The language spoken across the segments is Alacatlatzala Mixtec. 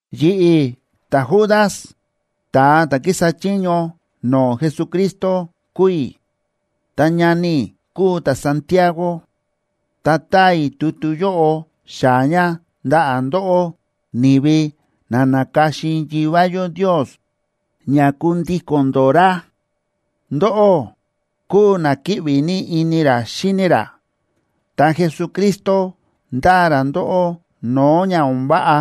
Yi̱ꞌi̱, ta̱Judas, ta̱a ta̱ kísa chiño no̱o̱ Jesucristo kúu i̱, ta ñani i̱ kúu ta̱Santiago.a Ta táa i̱ tutu yóꞌo xaa̱ ña ndaꞌa̱ ndóꞌó ni̱vi na na̱ka̱xin Yivá yó Ndios ña kundíko̱n ndó ra. Ndóꞌó kúu na kíꞌvi ní ini ra xíni ra, ta Jesucristo ndáa ra ndóꞌó no̱o̱ ña o̱n váꞌa.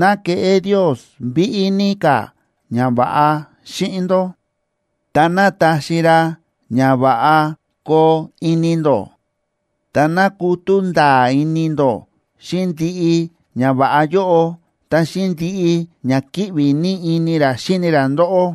Ná keꞌé Ndios víꞌí ní ka̱ ñava̱ꞌa xíꞌin ndó, ta ná taxi ra ña va̱ꞌa koo ini ndó. Ta ná kutú nda̱a̱ ini ndó xíꞌin ndiꞌi ñava̱ꞌa yóꞌo, ta xíꞌin ndiꞌi ña kíꞌvi ní ini ra xíni ra ndóꞌó.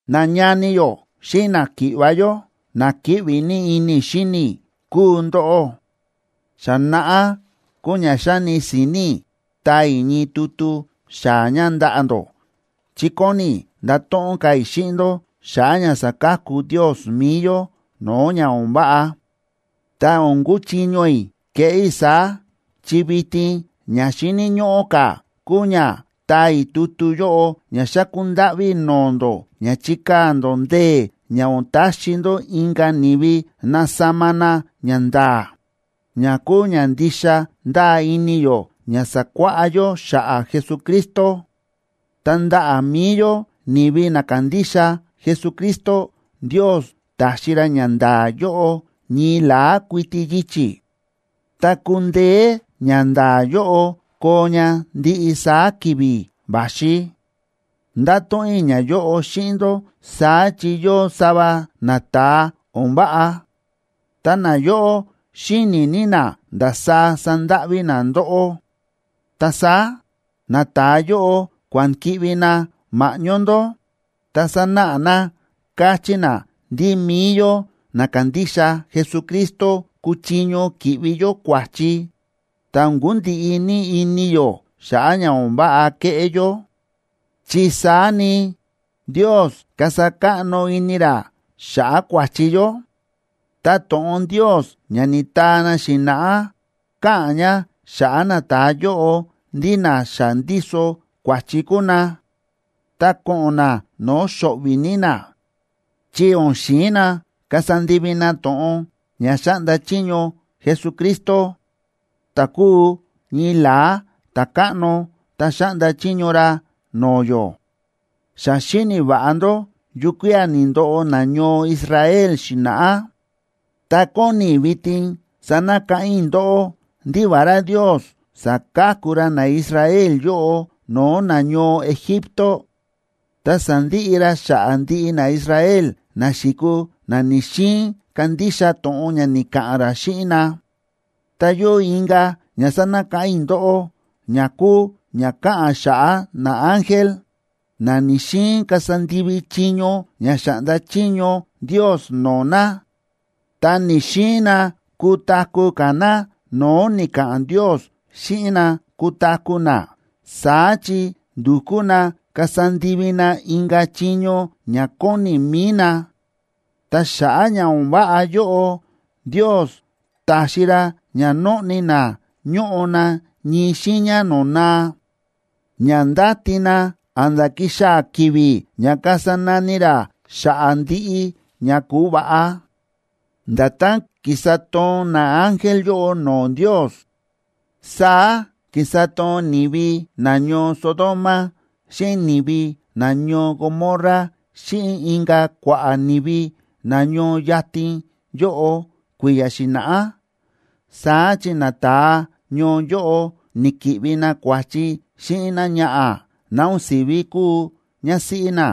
Nañani yó xíꞌin náki̱ꞌva̱ yó, na kíꞌvi ní ini i̱ xíni i̱ kúu ndóꞌó. Xa naꞌá kúu ña xa̱ni si̱ni̱ i̱ taa i̱ ñii tutu xaa̱ ña ndaꞌa̱ ndó, chi kóni i̱ ndato̱ꞌon ka̱ i̱ xíꞌin ndó xa̱ꞌa̱ ña sa̱ka̱ku Ndios mi̱i yó no̱o̱ ña o̱n váꞌa. Ta o̱n kúchiño i̱ keꞌé i̱ saá, chi vitin ña xíni̱ ñóꞌó ka̱ kúu ña taa i̱ tutu yóꞌo ña xáku ndáꞌví i̱ no̱o̱ ndó ña chikaa̱ ndó ndee̱ ña o̱n taxi ndó inka̱ ni̱vi nasama na ñanda̱a̱, ña kúu ña ndixa ndáa ini yó ña sa̱kuáꞌá yó xa̱ꞌa̱ Jesucristo. Ta ndaꞌa̱ mi̱i yó ni̱vi na kándixa Jesucristo, Ndios ta̱xi ra ñanda̱a̱ yóꞌo ñii la̱á kuiti yichi̱, ta kundeé ñanda̱a̱ yóꞌo koo ña ndiꞌi saá ki̱vi̱ va̱xi. Ndáto̱ꞌon i̱ ñayóꞌo xíꞌin ndó saá chi yóo sava nata̱a o̱n váꞌa, ta nayóꞌo xíni̱ ní na ndasaá sandáꞌví na ndóꞌó, ta saá nata̱a yóꞌo kua̱n ki̱ꞌvi na ma̱ꞌñó ndó, ta sánáꞌa na káchí na ndí mi̱i yó na kándixa Jesucristo kúchiño ki̱ꞌvi yó kua̱chi, ta o̱n kundiꞌi ní ini yó xa̱ꞌa̱ ña o̱n váꞌa kéꞌé yó, chi saá ni Ndios kasa káꞌno ini ra xa̱ꞌa̱ kua̱chi yó. Ta to̱ꞌon Ndios ña ni̱taa na xi̱na̱ꞌá káꞌa̱n ña xa̱ꞌa̱ nata̱a yóꞌo ndí na xa ndíso kua̱chi kúu na, ta ko̱ꞌo̱n na no̱o̱ xo̱ꞌvi̱ ní na, chi o̱n xi̱in na kasa ndivi na to̱ꞌon ña xáꞌnda chiño Jesucristo, ta̱ kúu ñii la̱á Ta̱káꞌno ta xáꞌnda chiño ra no̱o̱ yó. Xa xíni̱ va̱ꞌa ndó yukía̱ ni̱ndoꞌo nañoo Israel xi̱na̱ꞌá. Ta kóni i̱ vitin sanakáꞌán i̱ ndóꞌó ndí vará Ndios sa̱ka̱ku ra naIsrael yóꞌo no̱o̱ nañoo Egipto, ta sa̱ndiꞌi ra xa̱ꞌa̱ ndiꞌi naIsrael na xi̱kuu na ni̱‑xiin kandixa to̱ꞌon ña ni̱ka̱ꞌa̱n ra xíꞌin na. Ta yóo inka̱ ña sánakáꞌán i̱ ndóꞌó ña kúu ña káꞌa̱n xa̱ꞌa̱ naángel, na ni̱‑xiin kasa ndivi chiño ña xa̱ꞌnda chiño Ndios no̱o̱ na, ta ni̱‑xiin na kutaku̱ ka̱ na no̱o̱ ni̱ka̱ꞌa̱n Ndios xíꞌin na kutaku̱ na, saá chi ndu̱kú na kasa ndivi na inka̱ chiño ña kóni mi̱i na. Ta xa̱ꞌa̱ ña o̱n váꞌa yóꞌo, Ndios ta̱xi ra ña nóꞌni na ñóꞌo na ñii xiiña no̱o̱ naa, ña ndáti na a̱nda̱ kixaa̱ ki̱vi̱ ña kasa nani ra xa̱ꞌa̱ ndiꞌi ña ku̱va̱ꞌa. Nda̱tán ki̱sa toon naángel yóꞌo no̱o̱ Ndios, saá ki̱sa toon ni̱vi nañoo Sodoma xíꞌin ni̱vi nañoo Gomorra xíꞌin inka̱ kua̱ꞌa̱ ni̱vi na ñoo yatin yóꞌo kui̱ya̱ xi̱na̱ꞌá. Saá chi nata̱a ñoo yóꞌo ni̱ki̱ꞌvi na kua̱chi xíꞌin náñaꞌa̱ ná o̱n si̱ví kúu ñásíꞌí na,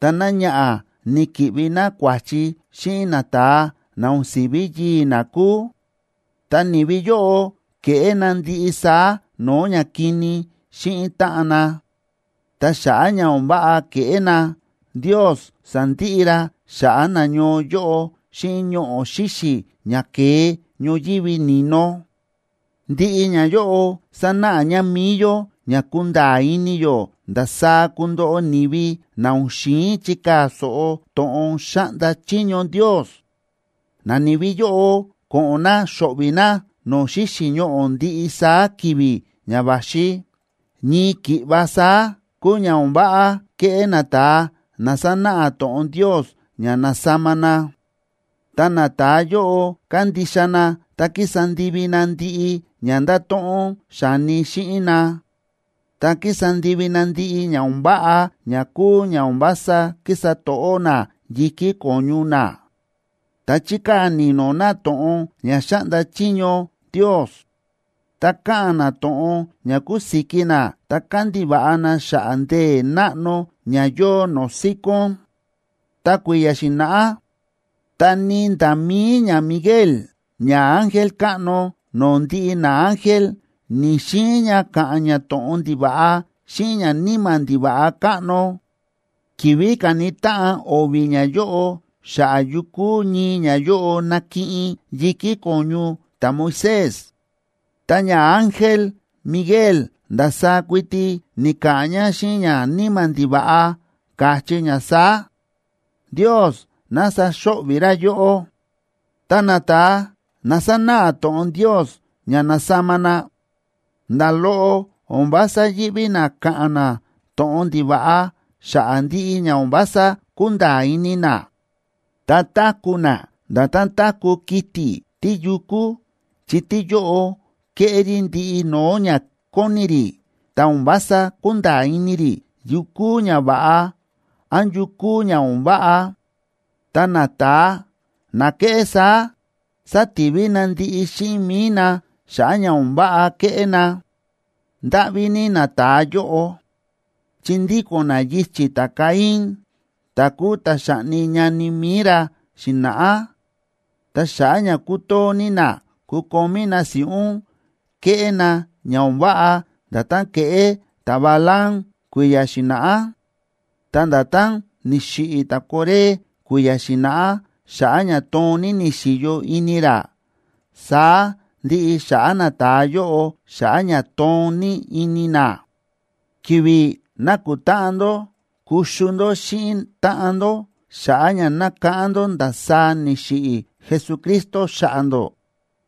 ta náñaꞌa̱ ni̱ki̱ꞌvi ná kua̱chi xíꞌin nata̱a na o̱n si̱ví yii̱ ná kúu, ta ni̱vi yóꞌo ke̱ꞌé na ndiꞌi saá no̱o̱ ñakini xíꞌin táꞌan na. Ta xa̱ꞌa̱ ña o̱n váꞌa ke̱ꞌé na, Ndios sa̱ndiꞌi ra xa̱ꞌa̱ nañoo yóꞌo xíꞌin ñoꞌo̱ xíxi̱ ña ke̱e ñoyívi ni̱no. Ndiꞌi ñayóꞌo sánáꞌa ña mi̱i yó ña kunda̱a̱ ini yó ndasaá kundoꞌo ni̱vi na o̱n xi̱in chikaa̱ so̱ꞌo to̱ꞌon xáꞌnda chiño Ndios. Nani̱vi yóꞌo ko̱ꞌo̱n na xo̱ꞌvi̱ na no̱o̱ xíxi̱ ñoꞌo̱ ndiꞌi saá ki̱vi̱ ña va̱xi. Ñii ki̱ꞌva saá, kúu ña o̱n váꞌa kéꞌé nata̱a na sánáꞌa to̱ꞌon Ndios ña na̱sama na. Ta nata̱a yóꞌo kándixa na ta kísa ndivi na ndiꞌi ña ndáto̱ꞌon xa̱ni xíꞌin na, ta kísa ndivi na ndiꞌi ña o̱n váꞌa ña kúu ña o̱n vása kísa to̱ꞌó na yi̱kí ko̱ñu na, ta chíkaa̱ ni̱no̱ na to̱ꞌon ña xáꞌnda chiño Ndios, ta káꞌa̱n na to̱ꞌon ña kusiki na ta kándiva̱ꞌa na xa̱ꞌa̱ ndee̱ náꞌno ña yóo no̱o̱ síkón. Ta kui̱ya̱ xi̱na̱ꞌá, ta ni nda̱ mi̱i ñaMiguel, ñaángel káꞌno no̱o̱ ndiꞌi naángel, ni̱‑xiin ña ka̱ꞌa̱n ña to̱ꞌon ndiva̱ꞌa xíꞌin ñaníma̱ ndiva̱ꞌa káꞌno, ki̱vi̱ káni táꞌan o̱vi̱ ñayóꞌo xa̱ꞌa̱ yukú ñii ñayóꞌo nakiꞌin yi̱kí ko̱ñu ta̱Moisés. Ta ñaángel Miguel ndasaá kuiti ni̱ka̱ꞌa̱n ña xíꞌin ñaníma̱ ndiva̱ꞌa, káchí ña saá: “¡Ndios ná saxo̱ꞌvi̱ ra yóꞌó!” Ta nata̱a na sánáꞌa to̱ꞌon Ndios ña na̱sama na, nda̱ loꞌo o̱n vása yíꞌví na káꞌa̱n na to̱ꞌon ndiva̱ꞌa xa̱ꞌa̱ ndiꞌi ña o̱n vása kúnda̱a̱ ini na. Ta táku̱ na nda̱tán táku̱ kiti̱ tíyukú, chi tíyóꞌo kéꞌé rí ndiꞌi no̱o̱ ña kóni rí, ta o̱n vása kúnda̱a̱ ini rí yu kúu ña va̱ꞌa án yu kúu ña o̱n váꞌa. Ta nata̱a na kéꞌé saá, sátivi na ndiꞌi xíꞌin mi̱i na xa̱ꞌa̱ ña o̱n váꞌa kéꞌé na. ¡Ndáꞌví ní nata̱a yóꞌo! Chi ndíko̱n na yichi̱ ta̱Caín, ta̱ kúu ta̱ xa̱ꞌni ñani mi̱i ra xi̱na̱ꞌá. Ta xa̱ꞌa̱ ña kútoo ní na kukomí na si̱ꞌún, kéꞌé na ña o̱n váꞌa nda̱tán ke̱ꞌé ta̱Balaam kui̱ya̱ xi̱na̱ꞌá. Ta nda̱tán ni̱xiꞌi̱ ta̱Coré kui̱ya̱ xi̱na̱ꞌá xa̱ꞌa̱ ña toon ní ni̱xi̱yo ini ra, saá ndiꞌi xa̱ꞌa̱ nata̱a yóꞌo xa̱ꞌa̱ ña toon ní ini na. Ki̱vi̱ nákutáꞌan ndó kuxu ndó xíꞌin táꞌan ndó xa̱ꞌa̱ ña nákáꞌán ndó ndasaá ni̱xiꞌi̱ Jesucristo xa̱ꞌa̱ ndó,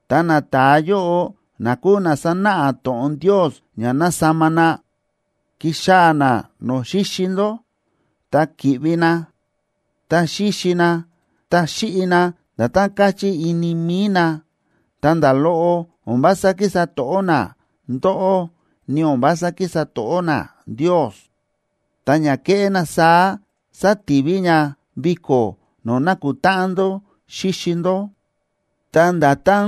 ta nata̱a yóꞌo na kúu na sánáꞌa to̱ꞌon Ndios ña na̱sama na, kíxaa̱ na no̱o̱ xíxi ndó ta kíꞌvi na, ta xíxi na ta xíꞌi na nda̱tán káchí ini mi̱i na, ta nda̱ loꞌo o̱n vása kísa to̱ꞌó na ndóꞌó ni o̱n vása kísa to̱ꞌó na Ndios. Ta ña kéꞌé na saá sátivi ña viko̱ no̱o̱ nákutáꞌan ndó xíxi ndó. Ta nda̱tán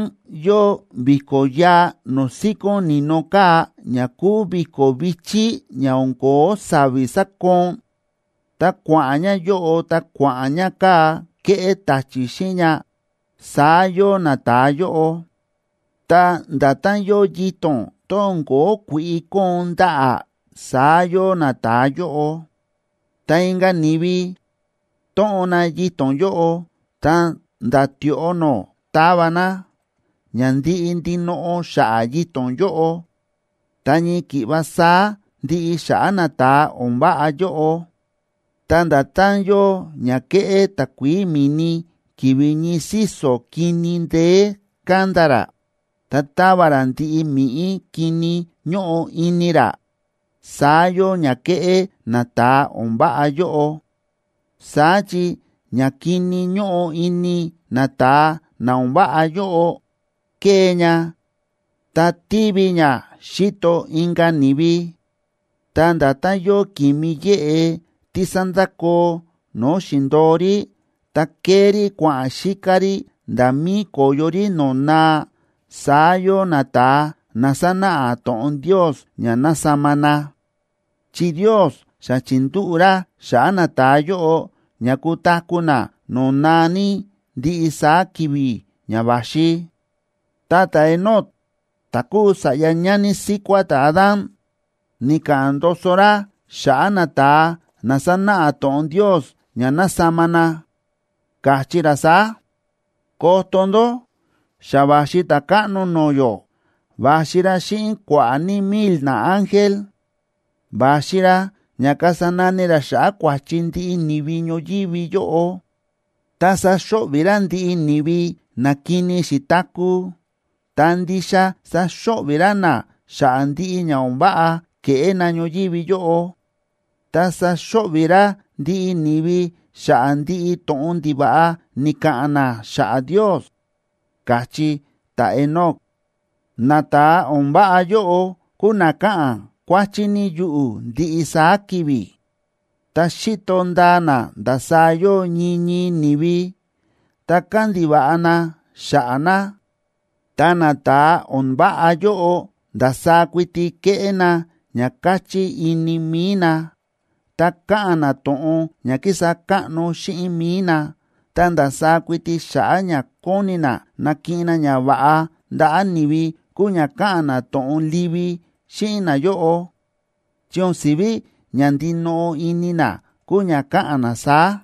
yóo vi̱ko̱ yaa no̱o̱ síkón ni̱no kaa̱ ña kúu vi̱ko̱ vi̱chí ña o̱n ko̱ó sa̱vi̱ sákoon, ta kua̱ꞌa̱n ña yóꞌo ta kua̱ꞌa̱n ña kaa̱ kéꞌé ta̱chi̱ xíꞌin ña, saá yóo nata̱a yóꞌo. Ta nda̱tán yóo yito̱n, tón o̱n ko̱ó kui̱ꞌi kóon ndaꞌa̱, saá yóo nata̱a yóꞌo, ta inka̱ ni̱vi tóꞌon na yito̱n yóꞌo ta̱nda̱ tioꞌo nó tava na, ña ndiꞌi ndinoꞌo xa̱ꞌa̱ yito̱n yóꞌo, ta ñii ki̱ꞌva saá ndiꞌi xa̱ꞌa̱ nata̱a o̱n váꞌa yóꞌo. Ta nda̱tán yóo ña kéꞌé takuií mi̱ni ki̱vi̱ ñii síso̱ kini ndeé kánda rá, ta táva rá ndiꞌi mi̱ꞌí kini ñóꞌo ini rá, saá yóo ña kéꞌé nata̱a o̱n váꞌa yóꞌo. Saá chi ñakini ñóꞌo ini nata̱a na o̱n váꞌa yóꞌo kée ña ta tívi ña xíto inka̱ ni̱vi. Ta nda̱tán yóo ki̱mi yéꞌe tí sándakoo no̱o̱ xi̱ndo̱o rí, ta kée rí kua̱ꞌa̱n xíká rí nda̱ mi̱i ko̱yo rí no̱o̱ naa, saá yóo nata̱a na sánáꞌa to̱ꞌon Ndios ña na̱sama na, chi Ndios xa chi̱ndúꞌu̱ ra xa̱ꞌa̱ nata̱a yóꞌo ña kutaku̱ na no̱o̱ naa ní ndiꞌi saá ki̱vi̱ ña va̱xi. Ta ta̱Enoc ta̱ kúu sa̱ꞌya ñani síkuá ta̱Adán,b ni̱ka̱ꞌa̱n ndoso ra xa̱ꞌa̱ nata̱a na sánáꞌa to̱ꞌon Ndios ña na̱sama na, káchí ra saá: “¡Koto ndó! Xa va̱xi Ta̱káꞌno no̱o̱ yó, va̱xi ra xíꞌin kua̱ꞌa̱ ní mil naángel. Va̱xi ra ña kasa nani ra xa̱ꞌa̱ kua̱chi ndiꞌi ni̱vi ñoyívi yóꞌo, ta saxo̱ꞌvi̱ ra ndiꞌi ni̱vi na kini xi̱taku̱, ta ndixa saxo̱ꞌvi̱ ra na xa̱ꞌa̱ ndiꞌi ña o̱n váꞌa ke̱ꞌé na ñoyívi yóꞌo, ta saxo̱ꞌvi̱ ra ndiꞌi ni̱vi xa̱ꞌa̱ ndiꞌi to̱ꞌon ndiva̱ꞌa ni̱ka̱ꞌa̱n na xa̱ꞌa̱ Ndios”, káchí ta̱Enoc. Nata̱a o̱n váꞌa yóꞌo kúu na káꞌa̱n kuáchí ní yuꞌu̱ ndiꞌi saá ki̱vi̱, ta xíto ndaa na ndasaá yóo ñii ñii ni̱vi ta kándiva̱ꞌa na xa̱ꞌa̱ na, ta nata̱a o̱n váꞌa yóꞌo ndasaá kuiti kéꞌé na ña káchí ini mi̱i na. Ta káꞌa̱n na to̱ꞌon ña kísa káꞌno xíꞌin mi̱i na, ta ndasaá kuiti xa̱ꞌa̱ ña kóni na nakiꞌin na ñava̱ꞌa ndaꞌa̱ ni̱vi kúu ña káꞌa̱n na to̱ꞌon livi xíꞌin nayóꞌo, chi o̱n si̱ví ña ndinoꞌo ini na kúu ña káꞌa̱n na saá.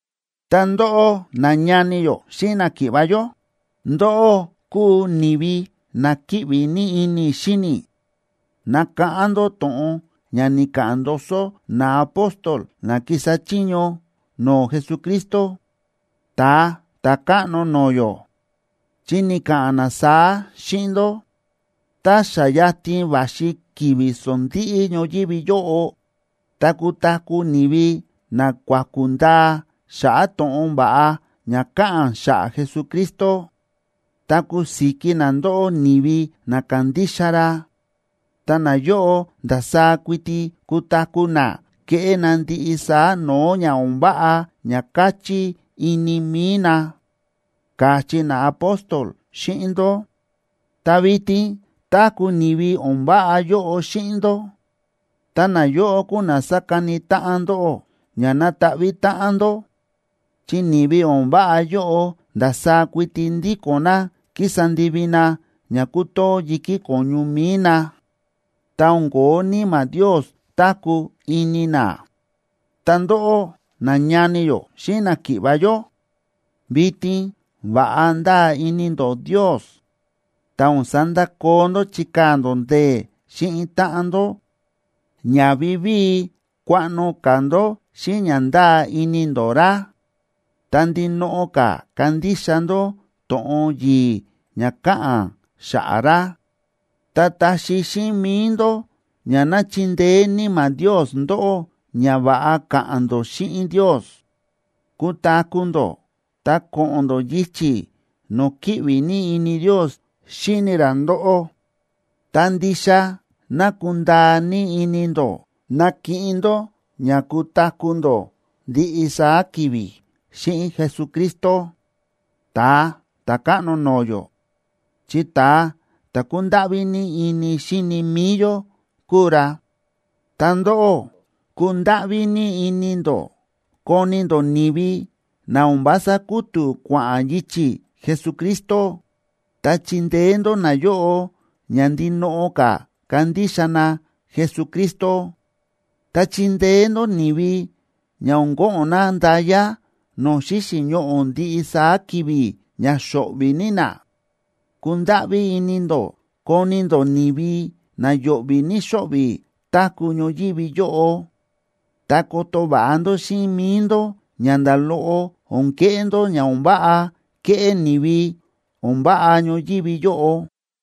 Ta ndóꞌó, nañani yó xíꞌin náki̱ꞌva̱ yó, ndóꞌó kúu ni̱vi na kíꞌvi ní ini i̱ xíni i̱. Nakáꞌán ndó to̱ꞌon ña ni̱ka̱ꞌa̱n ndoso naapóstol na ki̱sa chiño no̱o̱ Jesucristo, Ta̱a Ta̱káꞌno no̱o̱ yó, chi ni̱ka̱ꞌa̱n na saá xíꞌin ndó: “Tá xa yatin va̱xi ki̱vi̱ sondíꞌí ñoyívi yóꞌo, ta kutaku̱ ni̱vi na kuaku̱ ndaa xa̱ꞌa̱ to̱ꞌon va̱ꞌa ña káꞌa̱n xa̱ꞌa̱ Jesucristo, ta kusiki na ndóꞌó ni̱vi na kándixa ra, ta nayóꞌo ndasaá kuiti kutaku̱ na keꞌé na ndiꞌi saá no̱o̱ ña o̱n váꞌa ña káchí ini mi̱i na”, káchí naapóstol xíꞌin ndó. Ta vitin táku̱ ni̱vi o̱n váꞌa yóꞌo xíꞌin ndó, ta nayóꞌo kúu na sákani táꞌan ndóꞌó ña ná ta̱ꞌvi̱ táꞌan ndó, chi ni̱vi o̱n váꞌa yóꞌo ndasaá kuiti ndíko̱n na kísa ndivi na ña kútoo yi̱kí ko̱ñu mi̱i na, ta o̱n ko̱ó Níma̱ Ndios táku̱ ini na. Ta ndóꞌó, nañani yó xíꞌin náki̱ꞌva̱ yó, vitin va̱ꞌa ndáa ini ndó Ndios, ta o̱n sandakoo ndó chíkaa̱ ndó ndee̱ xíꞌin táꞌan ndó ña vivíi kuaꞌno ka̱ ndó xíꞌin ña ndáa ini ndó ra, ta ndinoꞌo ka̱ kandixa ndó to̱ꞌon yi̱i̱ ña káꞌa̱n xa̱ꞌa̱ ra. Ta taxi xíꞌin mi̱i ndó ña ná chindeé Níma̱ Ndios ndóꞌó ña va̱ꞌa ka̱ꞌa̱n ndó xíꞌin Ndios. Kutaku̱ ndó ta ko̱ꞌo̱n ndó yichi̱ no̱o̱ kíꞌvi ní ini Ndios xíni ra ndóꞌó, ta ndixa ná kundaa ní ini ndó nakiꞌin ndó ña kutaku̱ ndó ndiꞌi saá ki̱vi̱ xíꞌin Jesucristo, Ta̱a Ta̱káꞌno no̱o̱ yó, chi ta̱a ta̱ kúndáꞌví ní ini xíni mi̱i yó kúu ra. Ta ndóꞌó, kundáꞌví ní ini ndó koni ndó ni̱vi na o̱n vása kútu̱ kua̱ꞌa̱n yichi̱ Jesucristo, ta chindeé ndó nayóꞌo ña ndinoꞌo ka̱ kandixa na Jesucristo. Ta chindeé ndó ni̱vi ña o̱n ko̱ꞌo̱n na nda̱ya no̱o̱ xíxi̱ ñoꞌo̱ ndiꞌi saá ki̱vi̱ ña xo̱ꞌvi̱ ní na. Kundáꞌví ini ndó koni ndó ni̱vi na yo̱ꞌvi̱ ní xóꞌvi̱ táku̱ ñoyívi yóꞌo, ta koto va̱ꞌa ndó xíꞌin mi̱i ndó ña nda̱ loꞌo o̱n keꞌé ndó ña o̱n váꞌa kéꞌé ni̱vi o̱n váꞌa ñoyívi yóꞌo.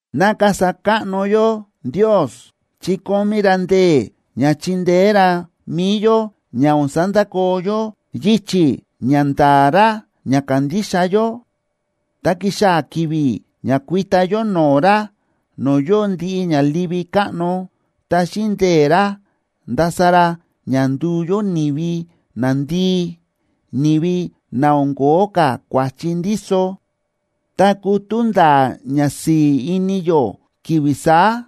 Ná kasa káꞌno yó Ndios, chi kómí ra ndee̱ ña chindeé ra mi̱i yó ña o̱n sandakoo yó yichi̱ ña nda̱a̱ ra ña kándixa yó. Ta kixaa̱ ki̱vi̱ ña kuita yó no̱o̱ ra no̱o̱ yóo ndiꞌi ña livi káꞌno, ta xíꞌin ndee̱ ra ndasa ra ña nduu yó ni̱vi nandii, ni̱vi na o̱n ko̱ó ka̱ kua̱chi ndíso, ta kutú nda̱a̱ ñasi̱i̱ ini yó ki̱vi̱ saá.